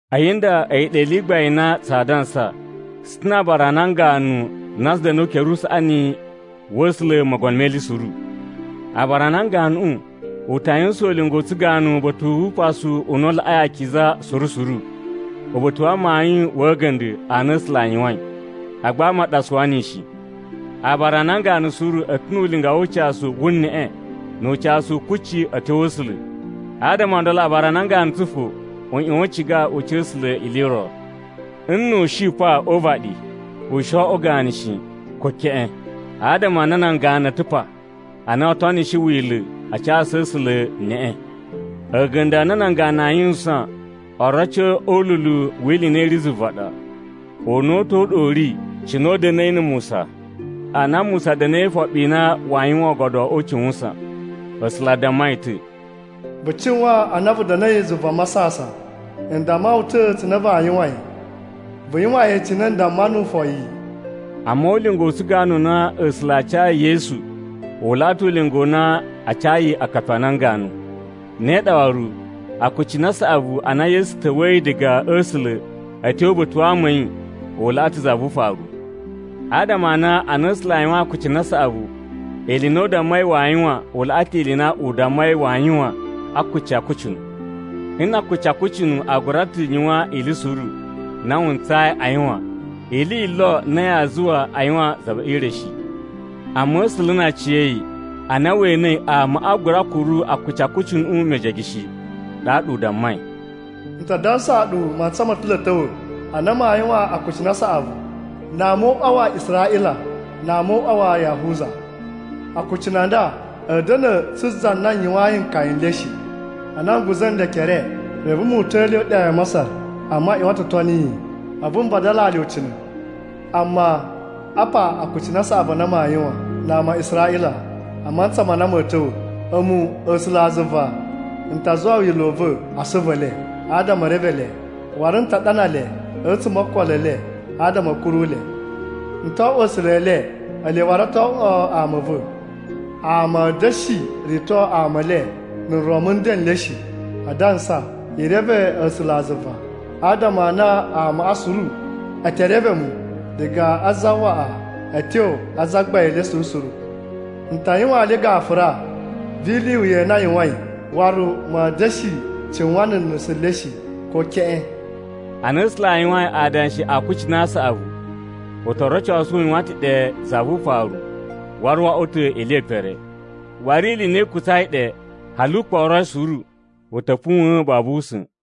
A̱yi nda a̱yi ɗa ili i gbain i na tsaa dansa: Tsu ta̱ na̱ aabara a nan ganu na tsu da̱nu o ukere usaꞌani wa̱ A̱sula̱ Mogono me Ili Suru. Aabara a nan ganuꞌu u ta yuwusan ulinga u tsuganu uba̱ta̱ wu Upasu u na u Laꞌai Akiza suru suru, uba̱ta̱ wa amayun wa̱ a̱ga̱nda̱ a na A̱sula̱ a yuwain, agba ama a ɗa a suwa niyi shi. Aabara a nan ganu suru a̱ ta̱ nu ulinga wu ucasu wu neꞌe nu ucasu u kucci a̱ tyo A̱sula̱. Adama o ndolo aabara a nan ganu tsu fo u ꞌyuwan u ciga u ca A̱sula̱ ili i ro. Nnu u shi pa o uvaɗi, u shi o oꞌwo ganu shi, ko keꞌen, adama a na nan ganu a̱ ta̱ pa, a na o tonishi Wila̱ a casu A̱sula̱ neꞌe. A̱ga̱nda̱ a na nan ganu aa yuwusan oroci o ululu wi ili i na i ri zuva ɗa. Una̱ta̱ u ɗa u ri cine u da̱na̱i na̱ Musa. Ana Musa da̱na̱i e ifoɓi i na waa yuwan Oogodo o Ucuwusan, A̱sula̱ a damma yi ta̱, “Vu cuwan ana vu da̱na̱i zuva masasan, n damma wu ta̱ cine vaa yuwan yi. Vu yuwan yi cine n damma nuwu foyi.” Amma ulinga u tsuganu u na A̱sula̱ a cayi Yesu u laꞌa ta̱ ulinga u na a cayi akapi a nan ganu. Ne ɗa waru, akucunu a saꞌavu a na Yesu ta̱wa̱yi diga a̱ A̱sula̱ a̱ tyo uba̱ta̱ wa ama a̱ yi u laꞌa ta̱ za vu ufaru. Adama a na ana A̱sula̱ a yuwain akucunu a saꞌavu, ili i na u dammai waa yuwan u laꞌa ta̱ ili i na u dammai waa yuwan a akuci a akucunu. Nna̱ akuci a akucunu a gura ta̱ yuwan ili suru na wu ntsayi a yuwan, ili yi lo na yaa zuwa a yuwan za ve ire shi. Amma A̱sula̱ na aciya̱yi, ana we enei amaꞌa a gura kuru akuci a akucunuꞌu mejege shi, ɗaɗa u dammai: “N ta dansaa ɗu, mantsa mo ta̱ lo a̱ ta̱wa̱, ana maa yuwan akucunu a saꞌavu, na ama o uꞌwa wa Israꞌila na ama o uꞌwa wa Yahuza. Akucunu a nda a̱a̱ da̱na̱ tsu za na n yuwayin nkaya n le shi, ana n guza̱ nle ekere reve mu uta̱a̱ le e iɗa ya Masar. Amma a ꞌyuwan ta̱ o toni yi, a̱vu n vadalaa le ucina̱. Amma, apa akucunu a saꞌavu a na maa yuwan na ama a Israꞌila a mantsa ma na ma̱a̱ ta̱wa̱: A̱mu, A̱sulazuva, n ta zuwa wila̱ u va̱ a asuvu e le, adama e reve le, waru n ta ɗana le a̱tsuma̱ o okolo e le, adama a̱ kuru le. N to oꞌwo A̱sula̱ e le, ele waru o to oꞌwo ama a̱ va̱. Ama a̱a̱ da̱shi rito ama e le, na̱ nron mu nden n le shi, adansa, ‘I reve A̱sulazuva,’ adama a na amaꞌa suru e te reve mu, diga a zawaꞌa a̱ tyo a zagbain le suru suru. N ta yuwaan le gafura vu ili i wuya i na a yuwain, waru ma̱a̱ da̱shi cuwan na̱ nusu le shi, ko keꞌen.” Ana A̱sula̱ a yuwain adanshi a akucunu a saꞌavu, u to rocosu u yuwan ta̱ ɗe za vu ufaru waru wo oꞌwo ta̱ ili ye pere. Waru ili i na i kutsai ɗe hali u kporoi suru u ta̱ puwa̱n babu usa̱n.